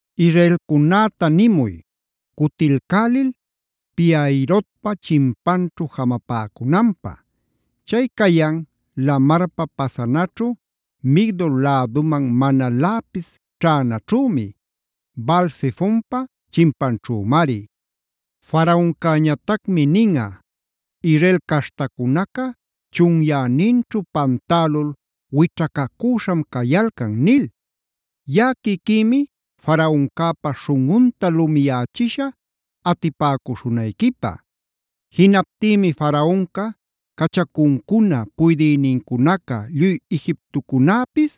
“Israelcunäta nimuy, cutilcälil Pi-hahirotpa chinpanćhu jamapäcunanpä. Chay cayan Lamarpa pasanaćhu Migdol läduman manaläpis ćhänaćhümi; Baal-zefonpa chinpanćhümari. Faraoncäñatacmi ninꞌa: ‘Israel caśhtacunaca chunyäninćhu pantälul wićhacacüśham cayalcan’ nil. Yaꞌa quiquïmi Faraoncäpa śhunꞌunta lumiyächishä atipäcuśhunayquipä. Jinaptïmi Faraonca, cachacuncuna, puydïnincunaca lluy Egiptocunäpis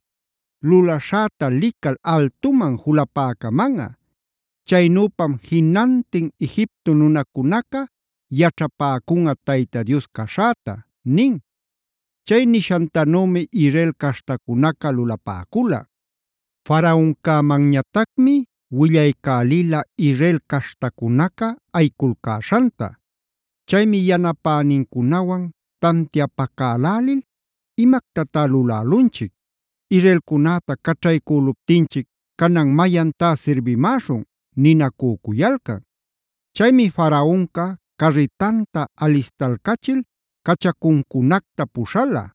lulaśhäta lical altuman julapäcamanꞌa. Chaynüpam jinantin Egipto nunacunaca yaćhapäcunꞌa Tayta Dios caśhäta” nin. Chay nishantanümi Israel caśhtacunaca lulapäcula. Faraoncämanñatacmi willaycälila Israel caśhtacunaca ayiculcäśhanta. Chaymi yanapänincunawan tantiapacälälil: “¡Imactatá lulälunchic! ¡Israelcunäta caćhaycüluptinchic canan mayantá sirbimäshun!” ninacücuyalcan. Chaymi Faraonca carritanta alistalcachil cachacuncunacta puśhala.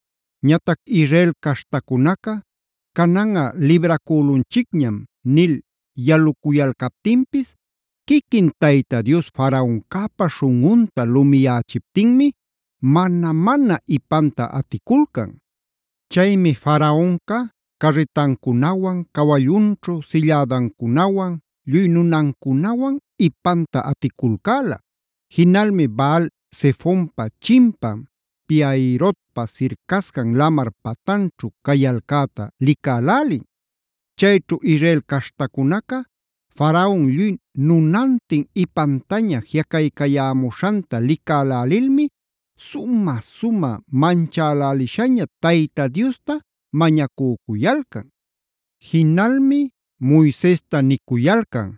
Ñatac Israel caśhtacunaca “cananꞌa libracülunchicñam” nil yaluyalcaptinpis, quiquin Tayta Dios Faraoncäpa śhunꞌunta lumiyächiptinmi mana-mana ipanta aticulcan. Chaymi Faraonca carritancunawan, cawallunćhu sillädancunawan, lluy nunancunawan ipanta aticulcäla. Jinalmi Baal-zefonpa chimpan Pi-hahirotpa sircascan lamar patanćhu cayalcäta licälälin. Chayćhu Israel caśhtacunaca Faraon lluy nunantin ipantaña jiꞌacaycayämuśhanta licälälilmi sumä-sumä manchälälishaña Tayta Diosta mañacücuyalcan. Jinalmi Moisesta nicuyalcan: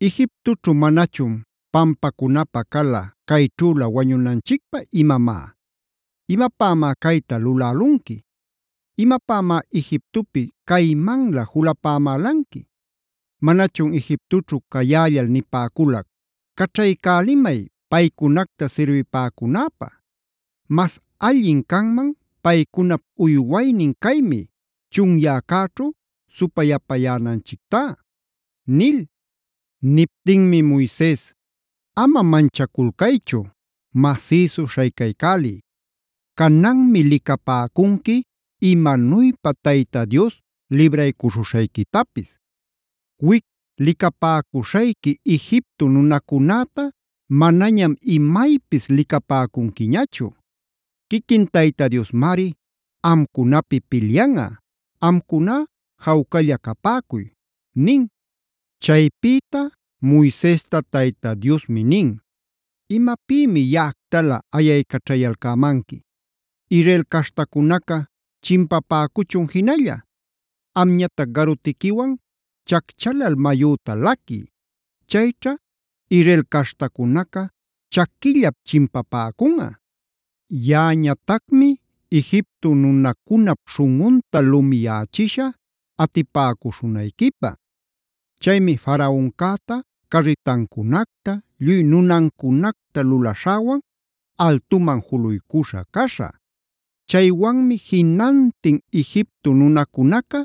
“¿Egiptoćhu manachun pampacunapä cala cayćhüla wañunanchicpä imamá? ¿Imapämá cayta lulälunqui? ¿Imapämá Egiptopi caymanlä julapämälanqui? ¿Manachun Egiptoćhu cayällal nipäculac: ‘Caćhaycälimay paycunacta sirbipäcunäpä? ¡Mas allin canman paycunap uywaynin caymi, chunyäcäćhu supayapayänanchictá!’” nil. Niptinmi Moises: “¡Ama manchaculcaychu! ¡Masïsu śhaycaycäliy! Cananmi licapäcunqui imanuypa Tayta Dios libraycuśhuśhayquitapis. Wic licapäcuśhayqui Egipto nunacunäta manañam imaypis licapäcunquiñachu. Quiquin Tayta Diosmari amcunapi pilyanꞌa; amcuná jawcalla capäcuy” nin. Chaypïta Moisesta Tayta Diosmi nin: “¿Imapïmi yaꞌactalä ayaycaćhayalcämanqui? Israel caśhtacunaca chimpapäcuchun jinalla. Amñatac garutiquiwan chacchalal mayüta laquiy. Chayćha Israel caśhtacunaca chaquillap chimpapäcunꞌa. Yaꞌañatacmi Egipto nunacunap śhunꞌunta lumiyächishä atipäcuśhunayquipä. Chaymi Faraoncäta, carritancunacta lluy nunancunacta lulaśhäwan altuman juluycuśha caśhä. Chaywanmi jinantin Egipto nunacunaca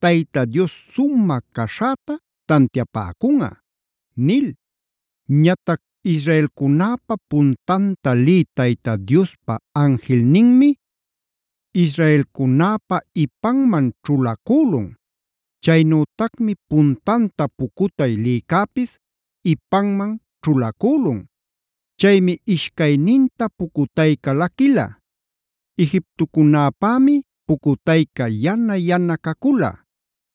Tayta Dios sumä caśhäta tantiapäcunꞌa” nil. Ñatac Israelcunäpa puntanta lï Tayta Diospa anjilninmi israelcunäpa ipanman ćhulacülun. Chaynütacmi puntanta pucutay lïcäpis ipanman ćhulacülun. Chaymi ishcayninta pucutayca laquila. Egiptocunapämi pucutayca yana-yana cacula.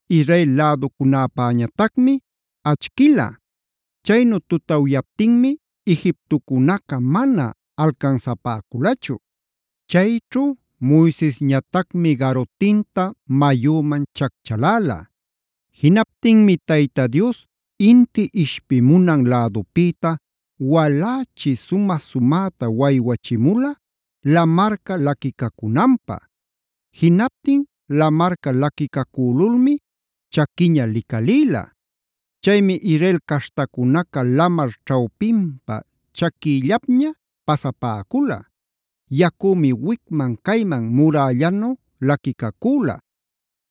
Israel läducunäpäñatacmi achquila. Chaynu tutawyaptinmi Egiptocunaca mana alcansapäculachu. Chayćhu Moisesñatacmi garutinta mayüman chacchaläla. Jinaptinmi Tayta Dios inti ishpimunan lädupïta walächi sumä-sumäta waywachimula lamarca laquicacunanpä.a Jinaptin lamarca laquicacülulmi chaquiña licalïla. Chaymi Israel caśhtacunaca lamar ćhawpinpa chaquïllapña pasapäcula;b yacümi wicman cayman murällanu laquicacüla.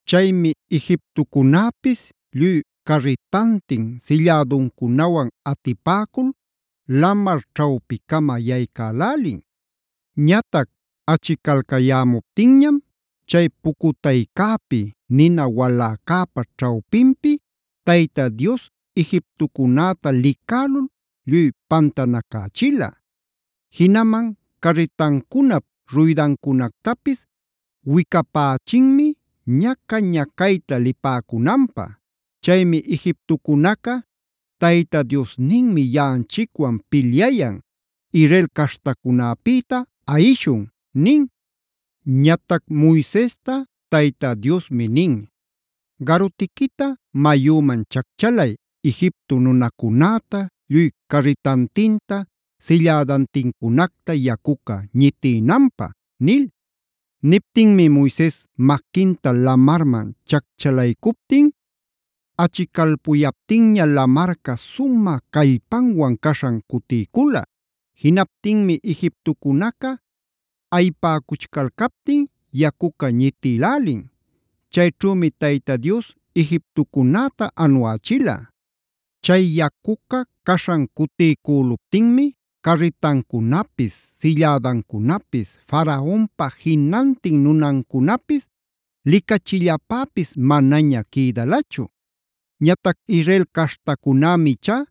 Chaymi Egiptocunäpis lluy carritantin, sillädancunawan atipäcul lamar ćhawpicama yaycälälin. Ñatac achicalcayämuptinñam chay pucutaycäpi, nina waläcäpa ćhawpinpi Tayta Dios Egiptocunäta licälul lluy pantanacächila. Jinaman carritancunap ruydancunactapis wicapächinmi ñaca-ñacayta lipäcunanpä. Chaymi Egiptocunaca: “Tayta Diosninmi yaꞌanchicwan pilyayan, Israel caśhtacunäpïta ayishun” nin. Ñatac Moisesta Tayta Diosmi nin: “Garutiquita mayüman chacchalay Egipto nunacunäta, lluy carritantinta, sillädantincunacta yacuca ñitïnanpä” nil. Niptinmi Moises maquinta lamarman chacchalaycuptin achicalpuyaptinña lamarca sumä callpanwan caśhan cutiycula. Jinaptinmi Egiptocunaca ayipäcuchcalcaptin yacuca ñitïlälin. Chayćhümi Tayta Dios Egiptocunäta anuächila. Chay yacuca caśhan cutiycüluptinmi carritancunapis, sillädancunapis, Faraonpa jinantin nunancunapis licachillapäpis manaña quïdalachu. Ñatac Israel caśhtacunämi ichá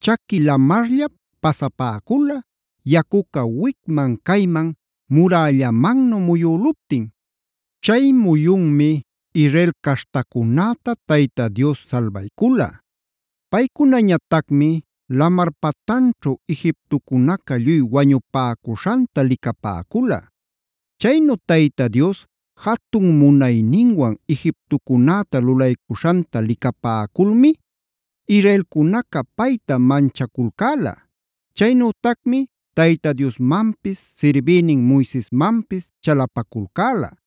chaqui lamarllap pasapäcula, yacuca wicman cayman murällamannu muyüluptin. Chay muyunmi Israel caśhtacunäta Tayta Dios salbaycula. Paycunañatacmi lamar patanćhu Egiptocunaca lluy wañupäcuśhanta licapäcula. Chaynu Tayta Dios jatun munayninwan Egiptocunäta lulaycuśhanta licapäculmi Israelcunaca payta manchaculcäla. Chaynütacmi Tayta Diosmanpis sirbïnin Moisesmanpis chalapaculcäla.